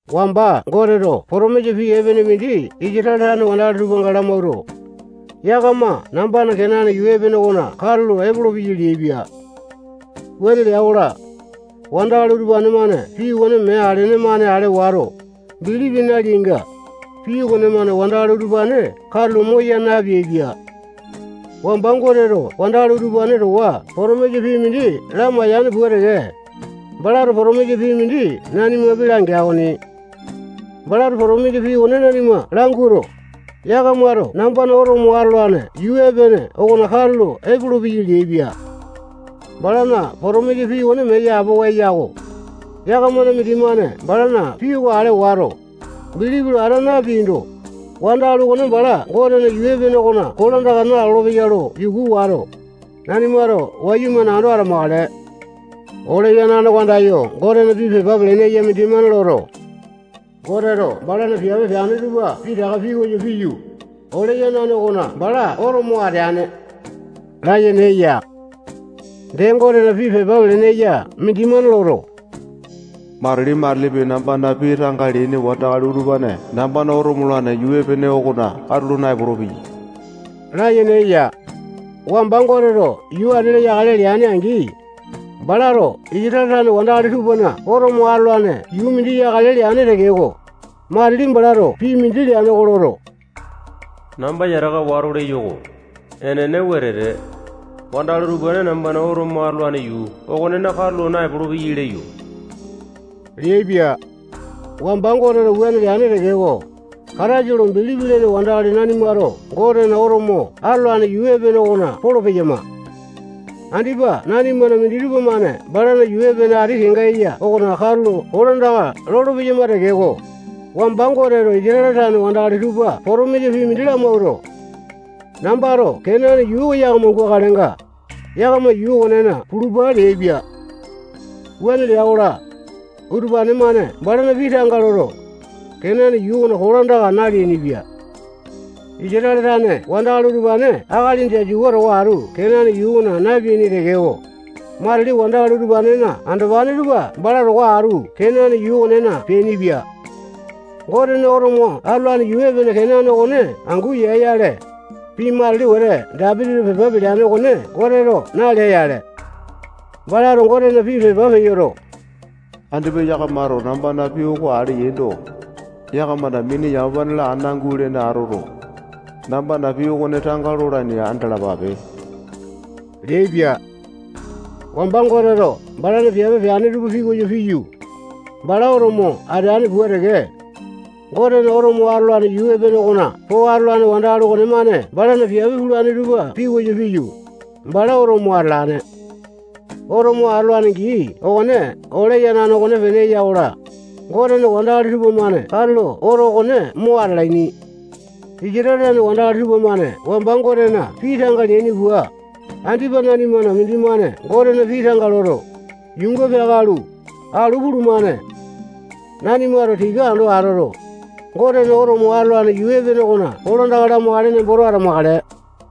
Wamba Goteto potomisa pii epene mindi Isatale tane wandakali tupanga lamawuato, yakama nambana Kenane yuu epene okona katulo epolopeyai leaipia. Wuane lea-kola, wandakali utupane-mane pii okone mee alene-mane ale wato, bilipi naleainga, pii okonemane wandakali utupane katulo moya napeaipia. Wamba Goteto wandakali utupane towa potomisa pii mindi lamaiyane pua teke, balato potomisa pii mindi nanimapi langea okoni. Balato potomisa pii okone nanima languato, yakamato nambana oto mo atolane yuu epene okona katulo epolopeyai leaipia. Balana potomisa pii okone mee yapowa eya-ko. Yakamana mindimane balana pii oko ale wato, bilipi lo ata napeando, wandakali okone bala Gotena yuu epene okona kolandaka nalolo-peya lo yuku wato, nanimato wayumane ando atamakale. Ole yanane oko andayo Gotena pii pepa pelene eya mindimane loto, Goteto balana piape peane tupa pitaka pikoyo piyu, ole yanane okona bala oto mo ateane layene eya. Dee, Gotena pii pepa pelene eya mindimane loto, matili-matilipi nambana pii tanga leaini wandakali utupane nambana oto molane yuu epene okona katulo naepolo-peyai layene eya. Wamba Goteto yuu ati-la yakale leane-angi, balato Isatale tane wandakali tupana oto mo atolane yuu mindi yakale leane tekeko, matili balato pii mindi leane oko loto, namba yataka wato leyo-ko. Enene wetete, wandakali utupane nambana oto mo atolane yuu okonena katulo naepolo-peyai leyo leaipia. Wamba Goteto wuane leane tekeko, Kataisa lo bilipi lene wandakali nanimato Gotena oto mo atolane yuu epene okona polo-peyama. Andipa nanimana minditupa-mane balana yuu epene ati kenga eya okona katulo kolandaka lolo-peyama tekeko, wamba Goteto Isatale tane wandakali tupa potomisa pii mindi lamawuato, nambato Kenane yuu oko yakama gukalenga, yakama yuu okonena pulupa leaipia. Wuane lea-kola, utupane-mane balana pii tanga loto, Kenane yuu okona kolandaka naleainipia. Isatale tane wandakali utupane Akali Jasua towa atu Kenane yuu okona napeaini tekeko, matili wandakali utupanena andopane tupa bala towa atu Kenane yuu okonena peainipia. Gotena oto mo atolane yuu epene Kenane okone angu ya-yale, pii matili wete Dapitito pepa peleane okone Goteto nalea-yale. Balato Gotena pii pepa peyoto, andipa yakamato nambana pii oko ale yaindo, yakamana mini yamapa-la ana gulene atoto, nambana pii okone tanga lolaini andalapape leaipia. Wamba Goteto balana piape peane tupa pikoyo piyu, bala oto mo ateane pua teke, Gotena oto mo atolane yuu epene okona po atolane wandakali okonemane balana piape pulane tupa pikoyo piyu, bala oto mo atalane. Oto mo atolane gii okone ole yanane okonepene eya-kola, Gotena wandakali tupamane katulo oto okone mo atalaini. Isatale tane wandakali tupamane wamba Gotena pii tanga leaini pua, andipa nanimana mindimane Gotena pii tanga loto, yuunga peakalu, alu pulumane. Nanimato tika ando atoto, Gotena oto mo atolane yuu epene okona kolandaka lamakale nemboto atamakale.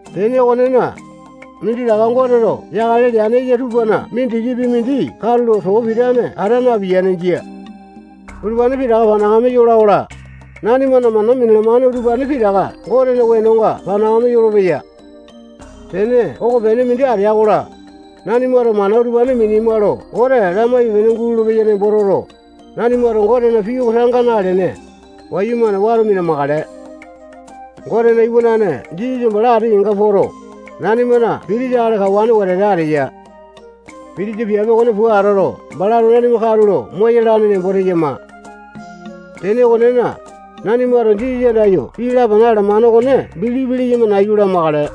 Tene okonena, minditaka Goteto yakale leane eya tupana mindikipi mindi katulo too pitane ata napiyane. Jia. Utupane pitaka panakame yola-kola, nanimana mana minalamane utupane pitaka Gotena wenonga panakame yolopeya. Tene okopene mindi atea-kola, nanimato mana utupane minema lo Gote lamaipe-pene gulolo-peya nembo toto, nanimato Gotena pii oko tanga nalene, wayumane wato mina-makale. Gotena iwanana Jisasa bala ati kenga poto, nanimana pitisa akali kawane wetete ateya. Pitisa piape okone pua atoto, balato nanima katulo moyalane nembo teyama. Tene okonena, nanimato Jisasa andayo pii lapana alamane okone bilipi leyama nayu lamakale.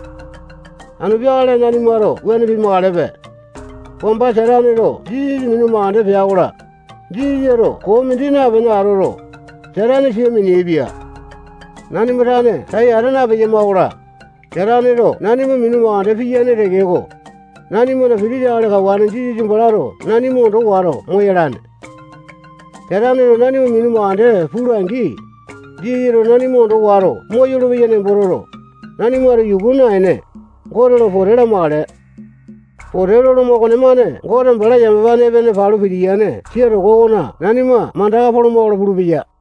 Anu peakale nanimato wuane pimakalepe. Wamba Sataneto Jisasa minu mandeke pea-kola, Jisasato koo mindi napene atoto, Satane sia mineaipia. Nanima tane tai ata napeyama-kola, Sataneto nanima minu mandeke piyane tekeko, nanimana pitisa akali kawane Jisasa balato nanima ondo wato moyalane. Sataneto nanima minu mandeke pula-angi, Jisasato nanima ondo wato moyolo-peya nembo toto, nanimato yuku naene, Gote lo pote lamakale. Pote loloma okonemane Gote bala yamapane epene palu pitiyane sia toko okona nanima mandaka poloma-kola pulupeya.